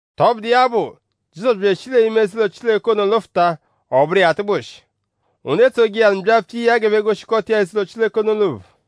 Tọbudu iya bụ; Jizọsu bya eshi l'ime eze-ụlo Chileke lụfuta; ọ bụru iya atụgbushi. Ndu etsoje iya nụ byapfuta iya g'ẹphe goshikọta iya eze-ụlo Chileke ono l'ophu.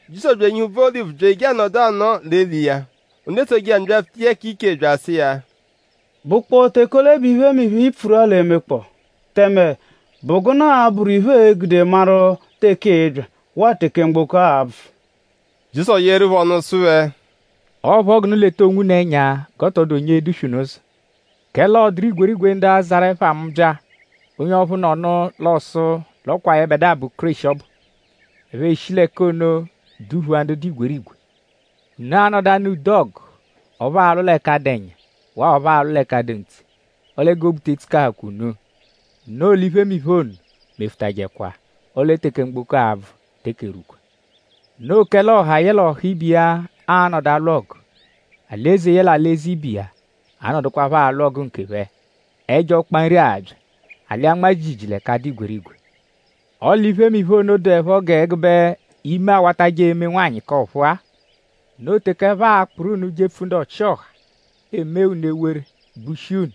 Jizọsu bya enyihu úbvú Olivu bya eje anọdu anọo l'eli iya. Ndu etsoje iya nụ byapfuta iya k'iche bya asụ iya: “?Bụkpoo teke ole bẹ iphemiphe-a, i pfuru-a l'e-mekpọo? Tẹme?bụ gụnu a-bụru iphe, ee-gude maru teke ịi-bya; waa teke mgboko a-bvụ?” Jizọsu yeeru phẹ ọnu sụ phẹ: “Ọo phọ g'unu leta onwunu ẹnya g'ọ tọ dụ onye e-duswe unu ụzo. Kẹle ọ dụru igwerigwe ndu a-zarụ ẹpha mu bya. Onye ọphu nọnu l'ọo-sụ l'ọ kwa yẹbedua bụ Kéreshi ọbu. Ẹphe eshi l'ẹka ono duphua ndu dụ igwerigwe. Unu a-nọdu anụ ude ọgu ọphu aalwụ l'ẹka dụ ẹnya; waa ọphu aalwụ l'ẹka dụ ntse; ọle g'obu te etsukahụkwa unu; noo l'iphemiphe ono mefụtajekwa. Ọle teke mgboko a-bvụ teke erwukwa. Noo kẹle ọha yẹle ọha ibe iya a-nọdu alwụ ọgu; alị-eze yẹle alị-eze ibe iya a-nọdukwapho alwụ ọgu nkephẹ. Ẹjo ọkpa nri a-bya. Alị anmaa jiijiijii l'ẹka dụ igwerigwe. Ọle iphemiphe ono dụepho g'ẹgube ime awatajẹ eme nwanyị k'ọ̀phúú-a. “Noo teke ẹphe a-kpụru unu jepfu ndu ọchi-ọha; eemee unu ewere; gbushia unu.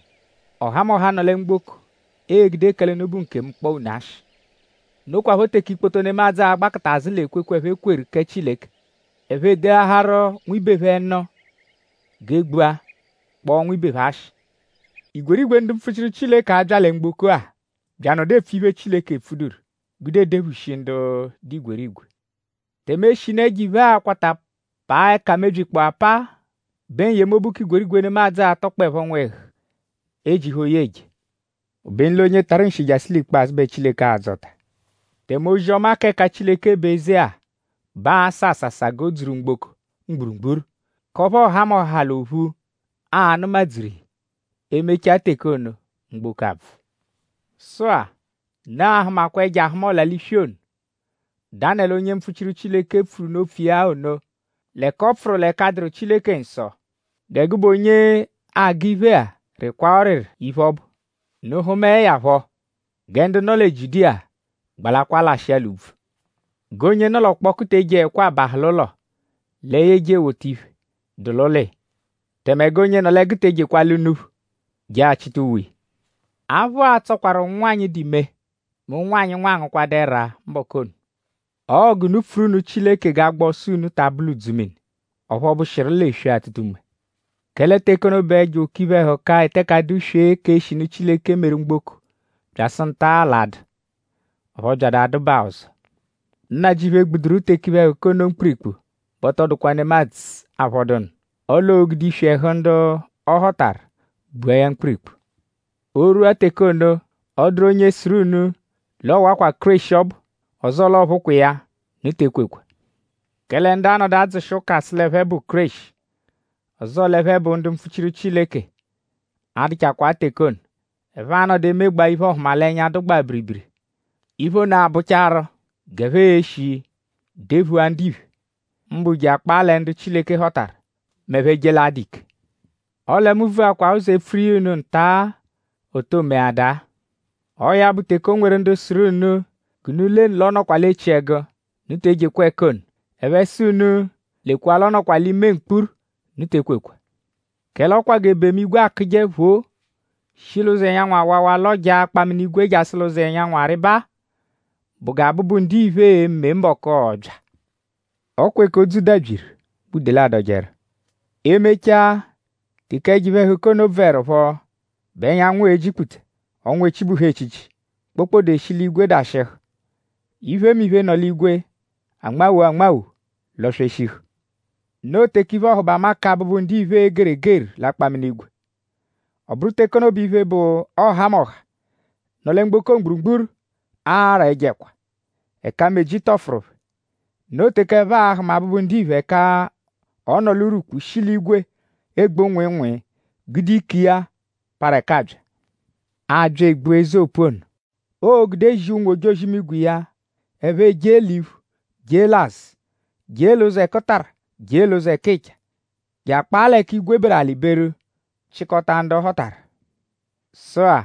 Ọhamoha, nọ lẹ mgboko egude kẹle unu bụ nkemu kpọo unu ashị. Nokwaphọ teke ikpoto nemadzụ a-gbakụta azụ l'ekwekwe, ẹphe kweru kẹ Chileke. Ẹphe edeaharu nwibe phẹ nụ g'e gbua; kpọo nwibe phẹ ashị. Igwerigwe ndu mpfuchiru a-bya lẹ mgboko-a bya anọdu epfu iphe, Chileke epfuduru; gude edephushi ndu dụ igwerigwe. Tẹme eshinu ẹjo-iphe a-kwata paa ẹka mebyikpọo apaa bẹ n-yemobu k'igwerigwe nemadzụ a-tọkpoepho nwẹhu ejihu oyi eje. Obenu l'onye tarụ nshi jasụ l'ikpazụ bẹ Chileke a-dzọta. Tẹme ozi-ọma k'ẹka Chileke bụ eze-a; bẹ aa-sà àsàsà g'o dzuru mgboko mgburugburu; k'ọphu ọhamoha l'ophu a-nụmadzuru iya. E -mechaa teke ono; mgboko abvụ.” “Sụ-a; unu a-hụmakwa ẹjo-ahụma-ọla-l'iswi ono, Danẹlu onye mpfuchiru pfuru unu opfu iya ono; l'ẹka ọ pfụru l'ẹka dụru Chileke nsọ. Gẹ gụbe onye agụ iphe-a rịkwaa ọriri iphe, ọ bụ. Unu -hụmae ya phọ; gẹ ndu nọ lẹ Jiudiya gbalakwaa lashịa l'úbvú. G'onye nọ l'ọkpoku te ejeẹkwa abahụ l'ụlo lẹ ya eje ewota iphe, dụ l'ụlo iya. Tẹme g'onye nọ l'ẹgu te ejekwa ala unuphu je achịta uwe iya. Aphụ a-tsọkwaru ụnwanyi, dụ ime; mẹ ụnwanyi, nwa angụkwadu ẹra mbọku ono. Ọo g'unu pfuru nụ Chileke g'agba ọso unu ta abụ l'udzumini; ọphu ọ bụshiru l'eswe-atụta-unme. Kẹle teke ono bẹ ẹjo oke iphe-ẹhuka, eteke adụ-swee k'eshinu Chileke meru mgboko byasụ nta-a l'a-dụ; ọphu ọ byadu adụbaa ọzo. Nnajịuphu -egbuduru teke iphe-ẹhuka ono mkpirikpu bẹ ọ tọ dụkwa nemadzụ aaphọdunu. Ọle oo-gude iswi ẹhu ndu ọ họtaru gbua ya mkpirikpu. “O -rwua teke ono; ọ -dụru onye sụru unu l'ọ wakwa Kéreshi ọbu; ọzoo l'ọ phụkwa iya; unu te ekwekwa. Kẹle ndu a-nọdu adzụshi ụka sụ l'ẹphe bụ Kéreshi; ọzoo l'ẹphe bụ ndu mpfuchiru Chileke; a-dụchakwaa teke ono. Ẹphe a-nọdu emegbaa iphe-ọhumalenya, dụgbaa biribiri. Iphe ono a-bụchaaru g'ẹphe e-shi dephua ndiphe; mbụ je akpaa lẹ ndu Chileke họtaru; m'ẹphe -je l'adụ ike. Ọle mu vuakwa ụzo epfuru iya unu nta-a, o too meadaa. “Ọo ya bụ; teke o nweru ndu sụru unu g'unu lenu l'ọ nọkwa l'echiẹgu; unu te ejekwa ẹka ono. Ẹphe -sụ unu: lekwa l'ọ nọkwa l'ime mkpuru; unu te ekwekwa. Kẹle ọ kwa g'ebemu-igwe akụje phoo; shi l'ụzo ẹnyanwu awawa lọjaa akpaminigwe jasụ l'ụzo ẹnyanwu arịba-a bụ gẹ Abụbu-Ndiphe e-me mbọku, ọo-bya. “Ọ kwa ẹka odzu dabyiru bẹ udele adọjeru.” E -mechaa; teke ẹjo iphe-ẹhuka ono bvụerupho bẹ ẹnyanwu e-jikputa; ọnwa echibuhu echichi; kpokpode eshi l'igwe dashịhu; iphemiphe, nọ l'igwe anmawo anmawo lọ-sweshihu. Noo teke iphe-ọhubama kẹ Abụbu-Ndiphe e-geru egeru l'akpaminigwe. Ọ bụru teke ono bẹ iphe, bụ ọhamoha, nọ lẹ mgboko mgburugburu a-ra ẹjo ẹkwa; ẹka meji tọfuru phẹ. Noo teke ẹphe a-hụma Abụbu-Ndiphe ẹka ọ nọ l'urwukpu shi l'igwe egbu nwịinwii gude ike iya, parụ ẹka abya. Aabya egbua eze opu ono, oo-gude zia ụnwu-ojozi-imigwe iya; ẹphe ejee l'iphu; jee l'azụ; jee l'ụzo ẹkutara; jee l'ụzo ẹkicha; je akpaa l'ẹka igwe beru; alị beru; chịkota ndu ọ họtaru. “Sụ-a;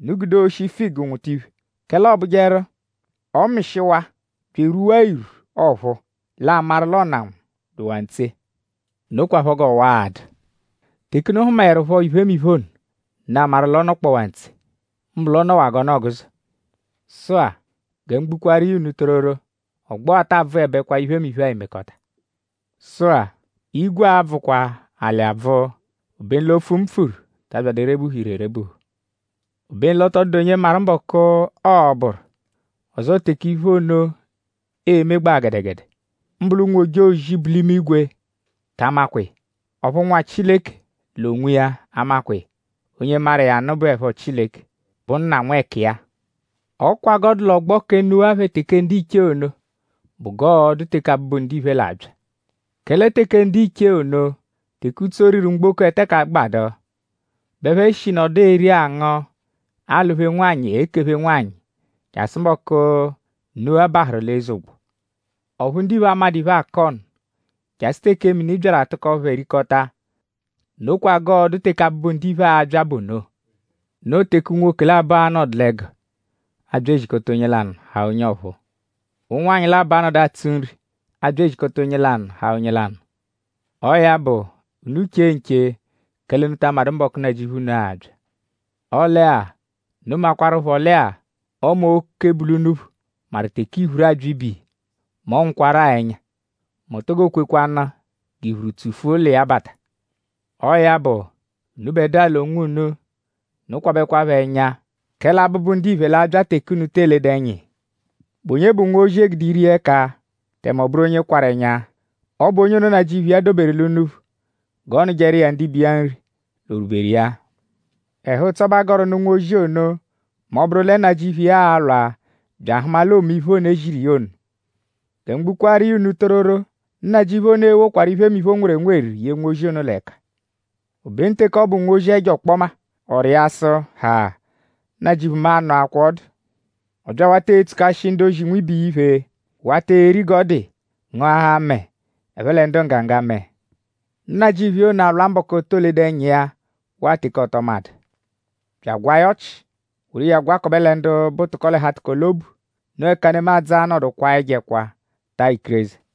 unu gude oshi figu nwụta iphe; kẹle ọobujeru; ọ -mịshiwaa bya erwua irwu ọ̀phúú; l'aamaru l'ọnanwu dụwaa ntse. Nokwaphọ g'ọwa-a dụ. Teke unu hụmaerupho iphemiphe ono; unu amaru l'ọ nọkpowaa ntse; mbụ l'ọ nọwaa g'ọnu-ọguzo. Sụ-a; gẹ mu gbukwaaru iya unu tororo; ọgbo-a taa bvụebekwa; iphemiphe-a emekọta. Sụ-a; igwe a-bvụkwa; alị abvụ; obenu l'opfu, mu pfuru ta abyadụ erebuhu ire erebuhu. “Obenu l'ọ tọ dụdu onye maru mbọku, ọo-bụru; ọzoo teke iphe ono e-megbaa gẹdegede. Mbụ l'ụnwu-ojozi, bu l'imigwe ta amakwa iya; ọphu Nwa Chileke l'onwiya amakwa iya. Onye maru iya nụ bụepho Chileke, bụ Nna nwẹkiya. Ọ kwa g'ọ dụ l'ọgbo kẹ Nuwa phẹ teke ndiche ono bụ g'ọo-dụ teke Abụbu-Ndiphe l'a-bya. Kẹle teke ndiche ono; teke utso, riru mgboko eteke agbadu; bẹ ẹphe shi nọdu eri angụ; alụ-phe nwanyị; ekephe nwanyị; jasụ mbọku, Nuwa bahụru l'eze ụgbo; ọphu ndiphe amadụ iphe, akọ nụ; jasụ teke mini byaru atụko phẹ rikọta. Nokwa g'ọo-dụ teke Abụbu-Ndiphe a-bya bụ ono. Noo teke unwoke labọ a-nọdu l'ẹgu; aabya ezikọta onye lanụ haa onye ọphuu. Ụnwanyi labọ a-nọdu atsụ nri; aabya ezikọta onye lanụ haa onye lanụ. Ọo ya bụ; unu che nche; kẹle unu ta amadụ mbọku, Nnajịuphu unu a-bya. Ọle-a; unu makwaruphọ lẹ-a; Ọme oke, bu l'unuphu maru teke iphuru abya ibe iya mẹ ọ nwụkwaru-a ẹnya; mẹ o to kwekwanụ g'iphuru tsufua ụlo iya bata. Ọo ya bụ; unubẹdua l'onwunu; unu kwabẹkwapho ẹnya; kẹle Abụbu-Ndiphe l'a-bya teke unu te eledu ẹnya iya.” “?Bụ onye bụ nwozi, e gude ire iya ẹka tẹme ọ bụru onye kwarụ ẹnya? Ọ bụ onye ono, nnajịuphu iya doberu l'unuphu g'ọ nụjeru iya ndibe iya nri l'orwuberu iya. Ẹhu-ụtso bẹ a gọru nụ nwozi ono mẹ ọ -bụru lẹ nnajịuphu iya a-lwa bya ahụma l'oome iphe ono, e ziru iya ono. Gẹ mu gbukwaaru iya unu tororo; nnajịuphu ono e-wokwaru iphemiphe, o nweru enweru ye nwozi ono l'ẹka. Obenu; teke ọ bụ nwozi ẹjo ọkpoma; ọ rịa sụ: ‘Ha! Nnajịuphu mu anọakwaa ọdu’. Ọ bya awata etsukashi ndu-ozi nwibe iya iphe; wata eri g'ọ dụ iya; ngụahaa mẹe; ẹphe lẹ ndu nggaga mẹe. Nnajịuphu iya ono a-lwa mbọku, o too ledu ẹnya iya waa teke ọ tọ madụ; bya agwaa ya ọchi; woru iya gwakọbe lẹ ndu bụ tụko-l'ẹhu-atụko-l'obu. Noo ẹka nemadzụ a-nọdu kwaa ẹjo ẹkwa; taa ikireze.”